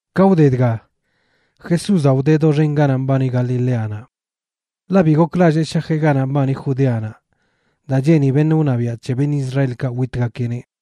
Ka wde dga, Jesúzaꞌ wdeꞌ doxen ganaꞌ mbani Galileanaꞌ. Ḻaꞌ bi goklallee shajeꞌ ganaꞌ mbani Judeanaꞌ daa cheeni beṉꞌ wṉabiaꞌ c̱he beṉꞌ Israelkaꞌ witgakeꞌneꞌ.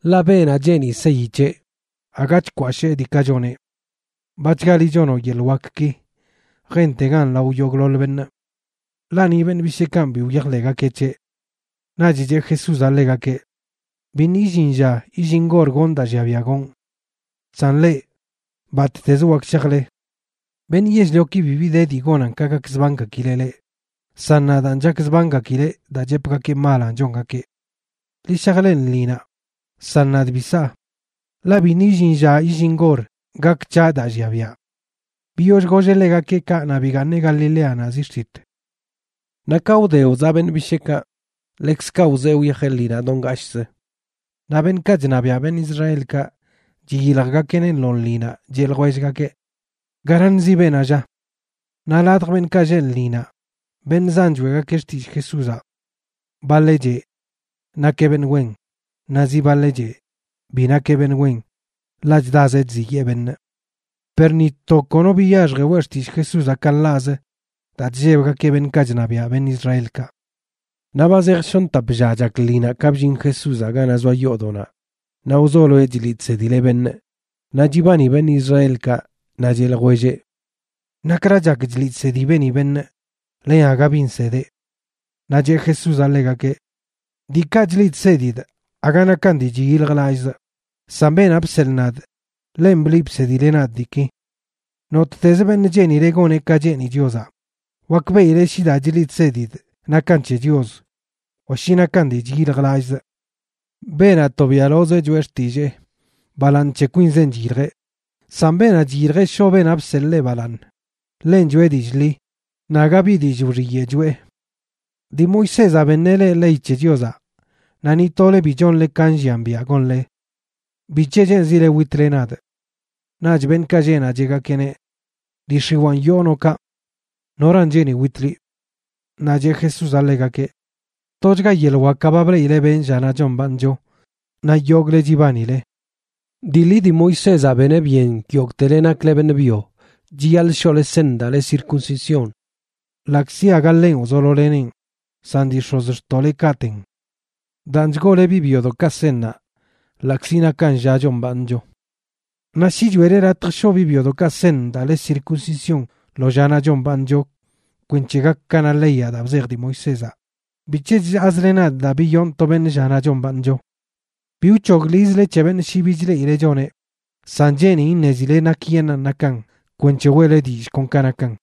Ḻaꞌ beenaꞌ cheeni seyi c̱heꞌ, aga chkwashee diikaꞌ choneꞌ. Bachgali chonoꞌ yeḻꞌ wakki, jentegan lao yogꞌḻoḻ beṉꞌ. Ḻaꞌ ni beṉꞌ bisheekanꞌ bi wyajḻeꞌgakeꞌ c̱heꞌ. Naꞌch cheꞌ Jesúzaꞌ ḻegakeꞌ: ―Biṉꞌ illin lla illin gor gonꞌ daa llia biaꞌ gonꞌ. San leꞌ, batꞌtez wak shajle. Beṉꞌ yell-lioki bibi de dii gonan ka gakzbangakileꞌ leꞌ, san nadaan chakzbangakileꞌ daa chepgakee malanꞌ chongakeꞌ. Ḻi shaj leꞌ lṉinaꞌ. San nadꞌ bi saa, ḻaꞌ biṉꞌ illin lla illin gor gak c̱haꞌ daa llia biaꞌ. Biyoll golleꞌ ḻegakeꞌ kaꞌ naꞌ bigaaṉeꞌ Galileanaꞌ zi xtit. Naꞌ ka wde wzaꞌ beṉꞌ bisheekaꞌ, ḻekzkaꞌ wzee wyajeꞌ lṉinaꞌ do ngashꞌz. Naꞌ beṉꞌkaꞌ chṉabiaꞌ beṉꞌ Israelkaꞌ chiyiljgakeꞌneꞌ lo lṉinaꞌ, cheꞌ ljwellgakeꞌ: ―¿Garaṉzi beenaꞌ, lla? Naꞌ ladj beṉꞌkaꞌ lleꞌ lṉinaꞌ, beṉꞌ zan choeꞌgakeꞌ xtillꞌ Jesúzaꞌ. Baḻeꞌ cheꞌ: “Nakeꞌ beṉꞌ wen.” Naꞌ zi baḻeꞌ cheꞌ: “Bi nakeꞌ beṉꞌ wen, ḻaꞌ chdazeꞌ chziyee beṉꞌ.” Per ni to kono biyaxji weꞌ xtillꞌ Jesúzaꞌ ka nḻaꞌz daa chllebgakeꞌ beṉꞌkaꞌ chṉabiaꞌ beṉꞌ Israelkaꞌ. Naꞌ ba zej shoṉ tap lla chak lṉinaꞌ ka bllin Jesúzaꞌ ganaꞌ zoa yoodoꞌnaꞌ naꞌ wzoloeꞌ chliꞌ chsedileꞌ beṉꞌ. Naꞌ chibani beṉꞌ Israelkaꞌ, naꞌ cheꞌ ljwelleꞌ: ―¿Nakra chak chliꞌ chsedi beeni beṉꞌ, len aga bi nsedeꞌ? Naꞌ cheꞌ Jesúzaꞌ ḻegakeꞌ: ―Diikaꞌ chliꞌ chsedidꞌ aga nakan dii chyiljlallꞌzꞌ, san beenaꞌ bseḻꞌ nadꞌ, ḻenꞌ bliꞌ bsedileꞌ nadꞌ diiki. Nottez beṉꞌ cheenileꞌ goneꞌ ka cheeni Chiozaꞌ, wakbeꞌileꞌ shi daa chliꞌ chsedidꞌ nakan c̱he Chios wa shi nakan dii chyiljlallꞌzꞌ. Beenaꞌ tobiaꞌlozeꞌ choꞌe xtillee, balaaṉ c̱he kwinzenꞌ chyiljeꞌ, san beenaꞌ chyiljeꞌ shoꞌ beenaꞌ bseḻꞌ ḻeꞌ balaaṉ, ḻenꞌ choꞌe dillꞌ ḻi, naꞌ aga bi dillꞌ wxiyeꞌ choꞌe. ’Dii Moisézaꞌ beṉeꞌ leꞌ ley c̱he Chiozaꞌ, naꞌ ni tole bi chonle ka nllian biaꞌ gonle. ¿Bic̱he cheenzile witle nadꞌ? Naꞌch beṉꞌkaꞌ lleꞌ naꞌ cheꞌgakeꞌneꞌ: ―Dii x̱iwaan yoo noꞌ kaꞌ. ¿Noran cheeni wit liꞌ? Naꞌ cheꞌ Jesúzaꞌ ḻegakeꞌ: ―Tochga yeḻꞌ wakaꞌ ba bleꞌile benꞌ llanaꞌ chombaaṉcho naꞌ yogꞌle chibanile. Dii ḻi dii Moisézaꞌ beneꞌ byen yogꞌtele nakle beṉꞌ byo chiyaḻꞌ shoꞌle seṉ daa le circuncisión, ḻaꞌkzi aga ḻenꞌ wzololeneꞌn, san dii x̱ozxtoꞌlekaꞌten. Daan chgoole biꞌ byodoꞌkaꞌ seṉnaꞌ ḻaꞌkzi nakan lla chombaaṉcho. Naꞌ shi choeꞌle latj shoꞌ biꞌ byodoꞌkaꞌ seṉ daa le circuncisión lo llanaꞌ chombaaṉcho kwenc̱he gak ka na leyaꞌ daa bzej dii Moisézaꞌ, ¿bic̱he chllaazle nadꞌ daa biyonꞌ to beṉꞌ llanaꞌ chombaaṉcho? Bi wc̱hogḻizle c̱he beṉꞌ shi bi chleꞌile choneꞌ, san cheenin iṉezile nakyeṉꞌan nakan kwenc̱he weꞌle dillꞌ kon ka nakan.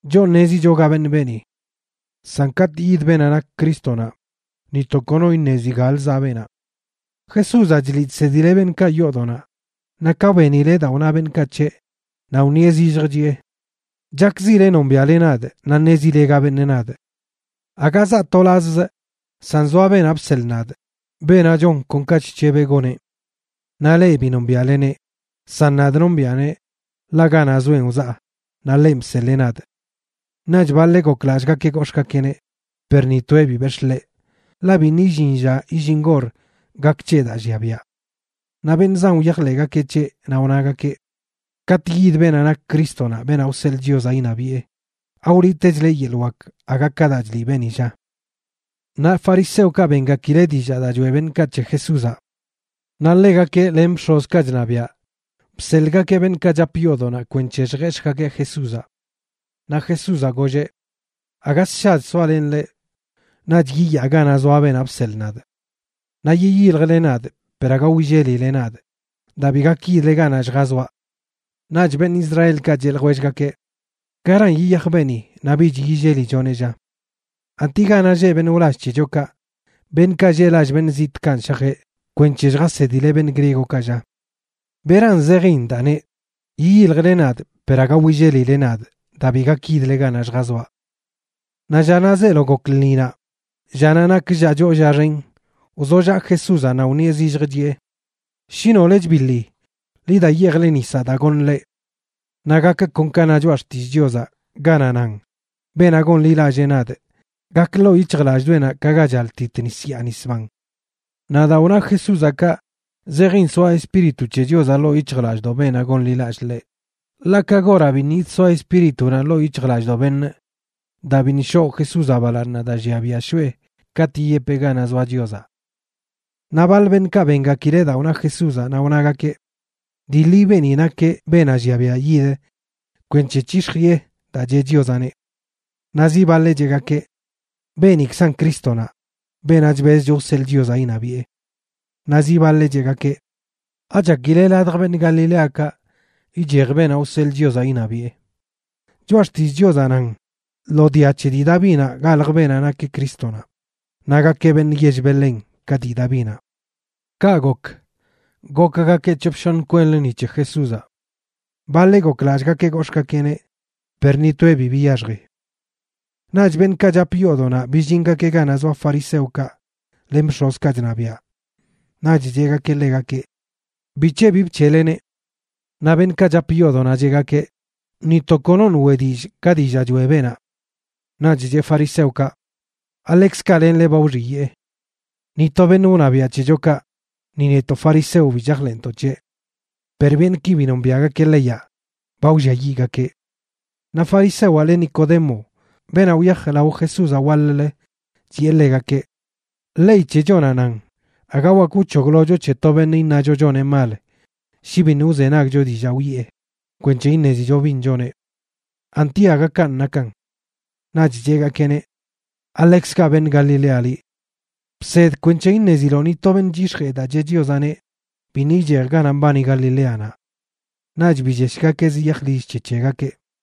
Choꞌ ṉezicho ga beṉꞌ beeni. San katꞌ yid beenaꞌ nak Crístonaꞌ, ni to kono iṉezi galə zaꞌ beenaꞌ. Jesúzaꞌ chliꞌ chsedileꞌ beṉꞌkaꞌ yoodoꞌnaꞌ, naꞌ ka benileꞌ daa wna beṉꞌkaꞌ c̱heꞌ, naꞌ wṉieꞌ zillj chiꞌe: ―Chakzile nombiaꞌle nadꞌ naꞌ ṉezile ga beṉꞌ nadꞌ. Aga zaa tolazzꞌ, san zoa beenaꞌ bseḻꞌ nadꞌ, beenaꞌ chon kon ka chc̱hebeꞌ goneꞌ. Naꞌ leꞌ bi nombiaꞌleneꞌ, san nadꞌ nombiꞌaneꞌ, ḻaꞌ ganaꞌ zoenꞌ wzaa, naꞌ ḻenꞌ bseḻee nadꞌ. Naꞌch baḻeꞌ goklallꞌgakeꞌ gox̱ꞌgakeꞌneꞌ, per ni toeꞌ bi bex̱ꞌ ḻeꞌ, ḻaꞌ biṉꞌ illin lla illin gor gak c̱heꞌ daa llia biaꞌ. Naꞌ beṉꞌ zan wyajḻeꞌgakeꞌ c̱heꞌ, naꞌ wnagakeꞌ: ―Katꞌ yid beenaꞌ nak Crístonaꞌ, beenaꞌ wseḻꞌ Chiozaꞌ iṉabiꞌe, ¿awliꞌtechleꞌ yeḻꞌ wak aga ka daa chliꞌ beeni, lla? Naꞌ fariseokaꞌ bengakileꞌ dillaa daa choeꞌ beṉꞌkaꞌ c̱he Jesúzaꞌ. Naꞌ ḻegakeꞌ len bx̱ozkaꞌ chṉabiaꞌ bseḻꞌgakeꞌ beṉꞌkaꞌ chap yoodoꞌnaꞌ kwenc̱he lljex̱ꞌgakeꞌ Jesúzaꞌ. Naꞌ Jesúzaꞌ golleꞌ: ―Aga sshach soalenꞌ leꞌ, naꞌch yiyaa ganaꞌ zoa beenaꞌ bseḻꞌ nadꞌ. Naꞌ yiyiljle nadꞌ per aga willelile nadꞌ daa bi gak yidle ganaꞌ lljazoaꞌ. Naꞌch beṉꞌ Israelkaꞌ cheꞌ ljwellgakeꞌ: ―¿Garan yiyaj beeni naꞌ bich yillelichoneꞌ, lla? ¿Anti ganaꞌ lleꞌ beṉꞌ wlall c̱hechokaꞌ, beṉꞌkaꞌ lleꞌ lall beṉꞌ zitꞌkanꞌ shajeꞌ kwenc̱he lljasedileꞌ beṉꞌ griegokaꞌ, lla? ¿Beran zejin daa neꞌ: “Yiyiljle nadꞌ, per aga willelile nadꞌ daa bi gak yidle ganaꞌ lljazoaꞌ”? Naꞌ llanaꞌ zeelo gok lṉinaꞌ, llanaꞌ nak lla choo lla xen, wzollaꞌ Jesúzaꞌ naꞌ wṉieꞌ zillj, chiꞌe: ―Shi nole chbiḻi, ḻi da yeejle nisaꞌ daa goṉꞌ leꞌ. Naꞌ gak kon ka na Choꞌa Xtillꞌ Chiozaꞌ ganaꞌ nan beenaꞌ gonḻilallee nadꞌ, gak ḻoo yic̱hjlallꞌdoꞌenaꞌ ka ga chaltit nis yaa nis ban. Naꞌ daa wna Jesúzaꞌ kaꞌ, zejin soa Espíritu c̱he Chiozaꞌ ḻoo yic̱hjlallꞌdoꞌ beenaꞌ gonḻilallꞌ ḻeꞌ. Ḻaꞌ ka goraꞌ biṉꞌ yidsoa Espíritunaꞌ ḻoo yic̱hjlallꞌdoꞌ beṉꞌ daa biṉꞌ shoꞌ Jesúzaꞌ balaaṉnaꞌ daa llia biaꞌ shoꞌe katꞌ yiyepeꞌ ganaꞌ zoa Chiozaꞌ. Naꞌ baḻ beṉꞌkaꞌ bengakileꞌ daa wna Jesúzaꞌ naꞌ wnagakeꞌ: ―Dii ḻi beeni nakeꞌ beenaꞌ llia biaꞌ yid kwenc̱he c̱hix̱jiꞌe daa cheꞌ Chiozaꞌneꞌ. Naꞌ zi baḻeꞌ cheꞌgakeꞌ: ―Beenikzanꞌ Crístonaꞌ, beenaꞌ chbezcho wseḻꞌ Chiozaꞌ iṉabiꞌe. Naꞌ zi baḻeꞌ cheꞌgakeꞌ: ―¿Achakile ladj beṉꞌ Galileakaꞌ ichej beenaꞌ wseḻꞌ Chiozaꞌ iṉabiꞌe? Choꞌa xtillꞌ Chiozaꞌ nan lo dia c̱he dii Davinaꞌ galj beenaꞌ nak Crístonaꞌ, naꞌ gakeꞌ beṉꞌ yell Belén ka dii Davinaꞌ. Kaꞌ gok, gokgakeꞌ c̱hop shoṉ kwenlə ni c̱he Jesúzaꞌ. Baḻeꞌ goklallꞌgakeꞌ gox̱ꞌgakeꞌneꞌ, per ni toeꞌ bi biyaxji. Naꞌch beṉꞌkaꞌ chap yoodoꞌnaꞌ billingakeꞌ ganaꞌ zoa fariseokaꞌ len bx̱ozkaꞌ chṉabiaꞌ. Naꞌch cheꞌgakeꞌ ḻegakeꞌ: ―¿Bic̱he bi bc̱heꞌleneꞌ? Naꞌ beṉꞌkaꞌ chap yoodoꞌnaꞌ cheꞌgakeꞌ: ―Ni to konoṉꞌ weꞌ dillꞌ ka dillaa choeꞌ beenaꞌ. Naꞌch cheꞌ fariseokaꞌ: ―¿Aḻekzkaꞌ lenle ba wxiyee? Ni to beṉꞌ wṉabiaꞌ c̱hechokaꞌ, ni netoꞌ fariseo bi chajḻeꞌntoꞌ c̱heꞌ. Per beṉꞌki bi nombiaꞌgakeꞌ leyaꞌ, ba wlliayiꞌgakeꞌ. Naꞌ farisewaꞌ le Nicodemo, beenaꞌ wyaj lao Jesúzaꞌ waḻ-lə, chiꞌe ḻegakeꞌ: ―Ley c̱hechonaꞌ nan aga wak wc̱hoglocho c̱he to beṉꞌ iṉacho choneꞌ mal shi biṉꞌ wzenagcho dillaa wiꞌe kwenc̱he iṉezicho bin choneꞌ. ¿Anti aga kanꞌ nakan? Naꞌch cheꞌgakeꞌneꞌ: ―¿Aḻekzkaꞌ beṉꞌ Galilea liꞌ? Bsed kwenc̱he iṉeziloꞌ ni to beṉꞌ chyix̱jee daa cheꞌ Chiozaꞌneꞌ biṉꞌ ichej ganaꞌ mbani Galileanaꞌ. Naꞌch billeshgakeꞌ ziyaj lill c̱he c̱hegakeꞌ.